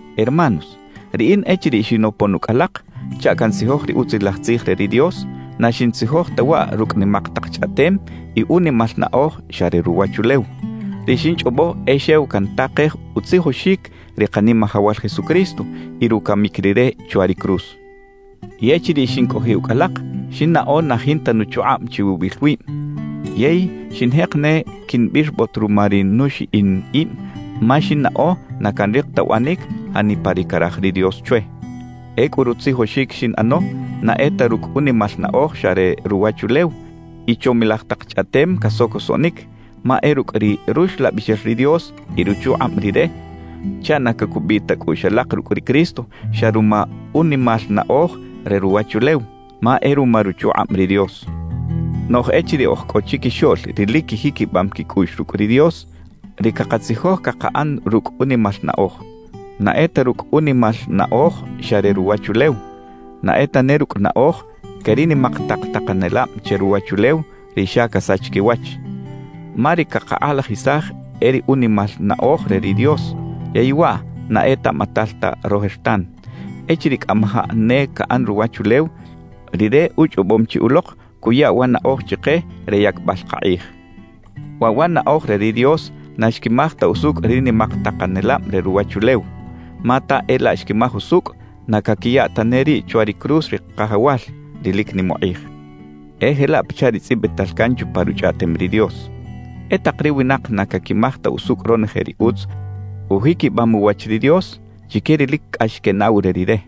Hermanos, riꞌin echiriꞌ xinopon ucꞌ alak chaꞌ cantzijoj ri Utzilaj Tzij re ri Dios, na xintzijoj ta waꞌ rucꞌ nimak tak chꞌaꞌtem y unimal naꞌoj xa re ruwachulew. Ri xinchꞌobo e xew cantakej utzijoxic ri Kanimajawal Jesucristo y rucamic Rire chwa ri cruz. Y echiriꞌ xincꞌojiꞌ ucꞌ alak, xinnaꞌo na jinta nuchukꞌab chiwibil wib, yey xinjek ne quinbirbot ruma ri nuxiꞌin ib ma xinnaꞌo na canrik ta uꞌanic janipa ri caraj ri Dios chwe. Ecꞌu rutzijoxic xinꞌano na e ta rucꞌ unimal naꞌoj xa re ruwachulew y chomilaj tak chꞌaꞌtem casocosoꞌnic, ma e rucꞌ ri Ruxlabixel ri Dios y ruchukꞌab Rire chaꞌ na cacubiꞌ ta cꞌuꞌx alak rucꞌ ri Cristo xa ruma unimal naꞌoj re ruwachulew, ma e ruma ruchukꞌab ri Dios. Noꞌj echiriꞌ oj cꞌo chiquixoꞌl ri lic quijiquibam quicꞌuꞌx rucꞌ ri Dios, ri cakatzijoj cakaꞌan rucꞌ unimal naꞌoj. Na e ta rucꞌ unimal naꞌoj xa re ruwachulew, na e tane rucꞌ naꞌoj que ri nimak tak takanelab che ruwachulew, ri xa casach quiwach. Ma ri cakakꞌalajisaj e ri unimal naꞌoj re ri Dios, yey waꞌ na etaꞌmatal ta rojertan. Echiriꞌ cꞌamajaꞌ ne caꞌan ruwachulew, Rire uchꞌobom chi ulok cuya wa naꞌoj chike re yacbal kakꞌij. Waꞌ wa naꞌoj re ri Dios na xquimaj ta usucꞌ ri nimak takanelab re ruwachulew. Ma ta e laꞌ xquimaj usucꞌ, na caquiya tane riꞌ chwa ri cruz ri Kajawal, ri lic nim ukꞌij. E jelaꞌ pachaꞌ ri tzꞌibital can chupa Ruchꞌaꞌtem ri Dios: E tak ri winak na caquimaj ta usucꞌ ronoje ri utz ujiquibam uwach ri Dios chique ri lic cꞌax quenaꞌw re Rire.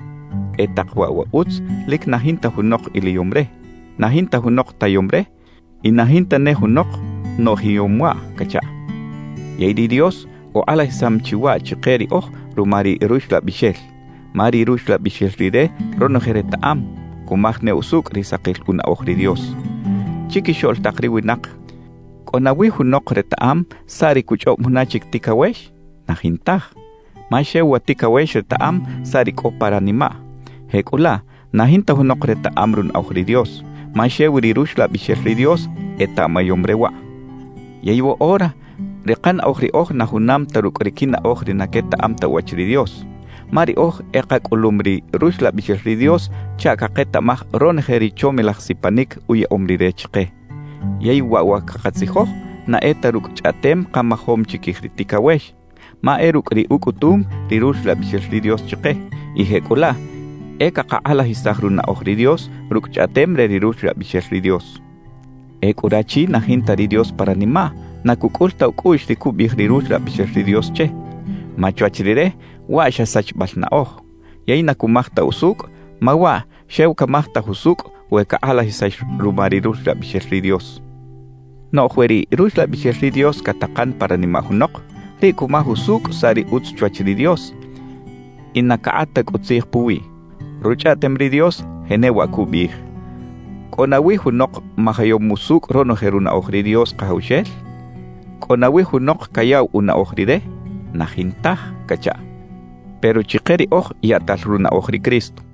E tak waꞌ wa utz lic na jinta junok iliyom re, na jinta junok tayom re y na jinta ne junok noꞌjiyom waꞌ cachaꞌ. Yey ri Dios ukꞌalajisam chi waꞌ chike riꞌoj ruma ri Ruxlabixel. Ma ri Ruxlabixel Rire ronoje retaꞌam, cumaj ne usucꞌ ri sakil unaꞌoj ri Dios. Chiquixoꞌl tak ri winak, ¿cꞌo nawi junok retaꞌam saꞌ ri cuchꞌob juna chic ticawex? Na jintaj. Ma xew wa ticawex retaꞌam saꞌ ri cꞌo pa ranimaꞌ. Jecꞌulaꞌ na jinta junok retaꞌam runaꞌoj ri Dios, ma xew ri Ruxlabixel ri Dios etaꞌmayom re waꞌ. Yey woꞌora, ri kanaꞌoj riꞌoj na junam ta rucꞌ ri quinaꞌoj ri na quetaꞌam ta uwach ri Dios. Ma riꞌoj e kacꞌulum ri Ruxlabixel ri Dios chaꞌ caketaꞌmaj ronoje ri chomilaj sipanic uyaꞌom Rire chike. Yey waꞌ wa cakatzijoj, na e ta rucꞌ chꞌaꞌtem kamajom chiquij ri ticawex, ma e rucꞌ ri ucꞌutum ri Ruxlabixel ri Dios chike. Y jecꞌulaꞌ e cakakꞌalajisaj runaꞌoj ri Dios rucꞌ chꞌaꞌtem re ri Ruxlabixel ri Dios. Ecꞌu rachi na jinta ri Dios pa ranimaꞌ, na cucꞌul ta ucꞌuꞌx ri cubiꞌij ri Ruxlabixel ri Dios che, ma chwach rire waꞌ xa sachibal naꞌoj; yey na cumaj ta usucꞌ, ma waꞌ xew camajtaj usucꞌ we cakꞌalajisax ruma ri Ruxlabixel ri Dios. Noꞌj we ri Ruxlabixel ri Dios catakan pa ranimaꞌ junok, riꞌ cumaj usucꞌ saꞌ ri utz chwach ri Dios, y na cakꞌat ta cꞌu tzij puwiꞌ. Ruchꞌaꞌtem ri Dios jenewaꞌ cubiꞌij: ¿Cꞌo nawi junok majayom usucꞌ ronoje runaꞌoj ri Dios Kajawxel? ¿Cꞌo nawi junok cayaꞌw unaꞌoj Rire? ¡Na jintaj! cachaꞌ. Pero chike riꞌoj yaꞌtal runaꞌoj ri Cristo.